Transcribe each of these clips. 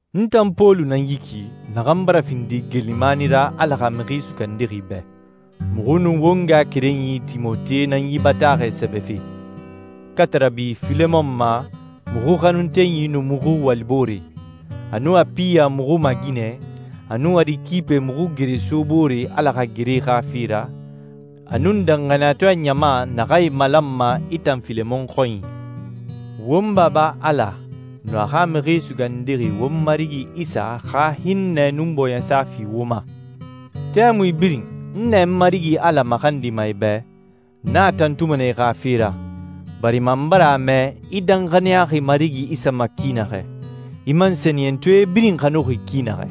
N tan Pɔlu nan yi ki, naxan bara findi geelimani ra Ala xa Mixi Sugandixi bɛ. Muxu nun won ngaxakerenyi Timote nan yi bataaxɛ sɛbɛfe, katarabi Filemon ma muxu xanuntenyi nun muxu waliboore, a nun Apiya muxu maaginɛ, a nun Arikipe muxu gereso boore Ala xa gere xa fe ra, a nun danxaniyatɔɛ ɲama naxan e malanma i tan Filemon xɔnyi. Won Baba Ala nun a xa Mixi Sugandixi, won Marigi Isa xa hinnɛ nun bɔɲɛsa fi wo ma. Tɛmui birin, n nɛ n Marigi Ala maxandima i bɛ, n a tantuma nɛ i xa fe ra, barima n bara a mɛ i danxaniyaxi Marigi Isa ma ki naxɛ, i man sɛniyɛntɔɛe birin xanuxi ki naxɛ.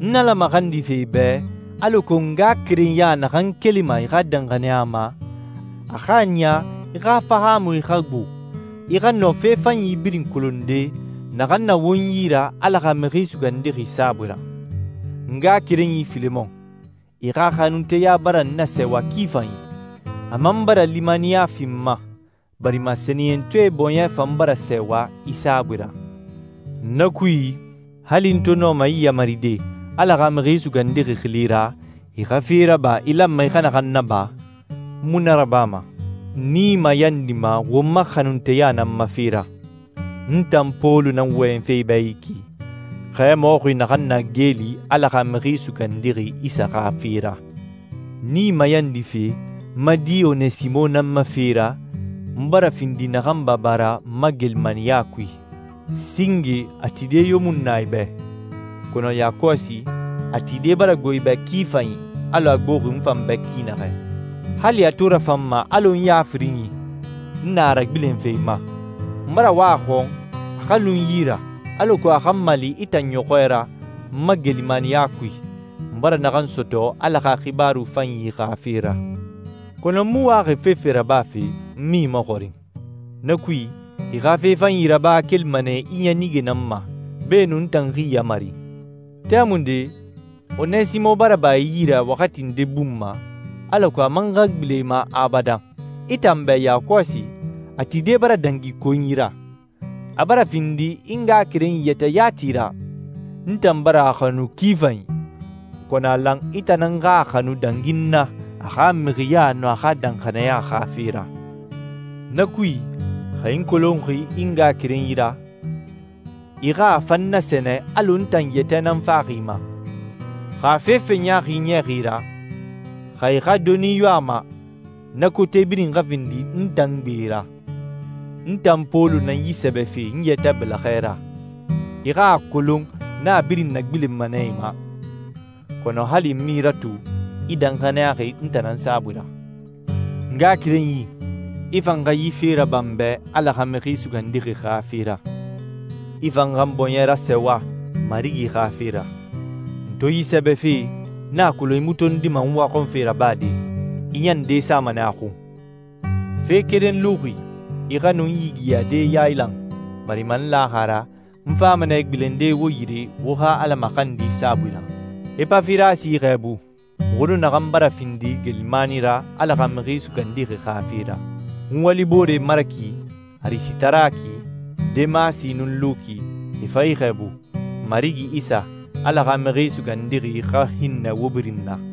N Ala maxandife i bɛ alako ngaxakerenya naxan kelima i xa danxaniya ma, a xa a niya i xa fahaamui xa gbo, i xa nɔ fe fanyi birin kolonde naxan na won yi ra Ala xa Mixi Sugandixi saabui ra. N ngaxakerenyi Filemon, i xa xanunteya bara n nasɛɛwa ki fanyi, a man bara limaniya fi n ma, barima sɛniyɛntɔɛe bɔɲɛ fan bara sɛɛwa i saabui ra. Na kui, hali n to nɔma i yamaride Ala xa Mixi Sugandixi xili ra, i xa fe raba i lanma i xa naxan naba, n mu na rabama. N i mayandima won ma xanunteya nan ma fe ra. N tan Pɔlu nan wɔyɛnfe i bɛ yi ki, xɛmɔxi naxan na geeli Ala xa Mixi Sugandixi Isa xa fe ra. N i mayandife n ma di Onesimo nan ma fe ra, n bara findi naxan baba ra n ma geelimaniya kui. Singe, a tide yo mu nu na i bɛ, kɔnɔ yakɔsi, a tide bara gbo i bɛ ki fanyi, alɔ a gboxi n fan bɛ ki naxɛ. Hali a to rafan n ma alɔ n ya firinyi, n na a ragbilenfe i ma. N bara wa a xɔn a xa lu n yi ra, alako a xa n mali i tan ɲɔxɔɛ ra n ma geelimaniya kui, n bara naxan sɔtɔ Ala xa xibaaru fanyi xa fe ra. Kɔnɔ n mu waxi fefe rabafe n mu i maxɔrin. Na kui, i xa fe fanyi raba kelima nɛ i ɲanige nan ma, beenun n tan xa i yamari. Tɛmunde, Onesimo bara ba i yi ra waxati nde bun ma, alako a man xa gbilen i ma abadan. I tan bɛ yakɔsi, a tide bara dangi konyi ra. A bara findi i ngaxakerenyi yɛtɛ yati ra. N tan bara a xanu ki fanyi, kɔnɔ a lan i tan nan xa a xanu dangi n na a xa mixiɲa nun a xa danxaniya xa fe ra. Na kui, xa i n kolonxi i ngaxakerenyi ra, i xa a fan nasɛnɛ alɔ n tan yɛtɛ nan faxi i ma. Xa a fefe ɲaaxi niyaxi i ra, xa i xa doni yo a ma, na kote birin xa findi n tan gbe ra. N tan Pɔlu nan yi sɛbɛfe n yɛtɛ bɛlɛxɛ ra, i xa a kolon n a birin nagbilenma nɛ i ma. Kɔnɔ hali n mu i ratu, i danxaniyaxi n tan nan saabui ra. N ngaxakerenyi, i fan xa yi fe raba n bɛ Ala xa Mixi Sugandixi xa fe ra. I fan xa n bɔɲɛ rasɛɛwa, Marigi xa fe ra. N to yi sɛbɛfe, n a kolon i mu tondima n waxɔnfe rabade, i ɲan nde sama nɛ a xun. Fe keren luxi: I xa nu n yigiyade yailan, barima n laxi a ra, n fama nɛ gbilende wo yire wo xa Ala maxandi saabui ra. Epafirasi i xɛɛbu, muxu nun naxan bara findi geelimani ra Ala xa Mixi Sugandixi xa fe ra. N walibooree Maraki, Arisitaraki, Demasi, nun Luki, e fan i xɛɛbu. Marigi Isa, Ala xa Mixi Sugandixi, xa hinnɛ wo birin na.